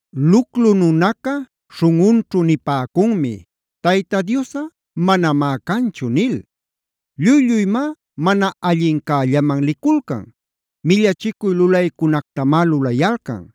Luclu nunacunaca śhunꞌunćhu nipäcunmi: “Tayta Diosꞌa manamá canchu” nil. Lluy-lluymá mana allincällaman liculcan. Millachicuy lulaycunactamá lulayalcan.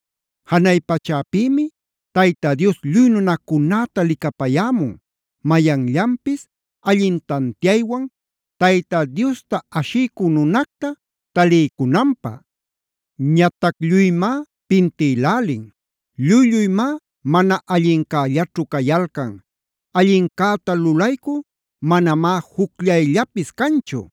Janay pachäpïmi Tayta Dios lluy nunacunäta licapayämun, mayanllapis allin tantiaywan Tayta Diosta ashiycü nunacta taliycunanpä. Ñatac lluymá pintïlälin. Lluy-lluymá mana allincällaćhu cayalcan. Allincäta lulaycü manamá jucllayllapis canchu.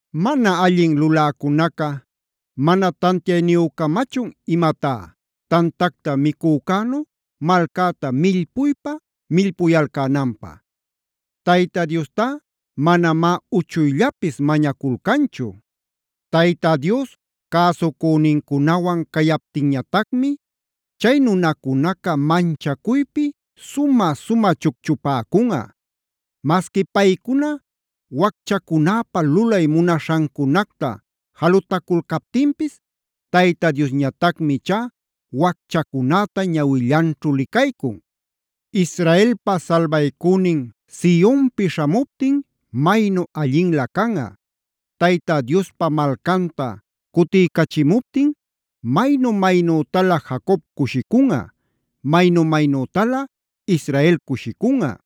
¿Mana allin luläcunaca mana tantiayniyücamachun imatá, tantacta micücänu malcäta millpuypa-millpuyalcänanpä? Tayta Diostá manamá uchuyllapis mañaculcanchu. Tayta Dios cäsucünincunawan cayaptinñatacmi chay nunacunaca manchacuypi sumä-sumä chucchupäcunꞌa. Masqui paycuna wacchacunäpa lulay munaśhancunacta jalutaculcaptinpis Tayta Diosñatacmi ichá wacchacunäta ñawillanćhu licaycun. ¡Israelpa salbaycünin Sionpi śhamuptin maynu allinlä canꞌa! Tayta Diospa malcanta cutiycachimuptin maynu-maynütalä Jacob cushicunꞌa, maynu-maynütalä Israel cushicunꞌa.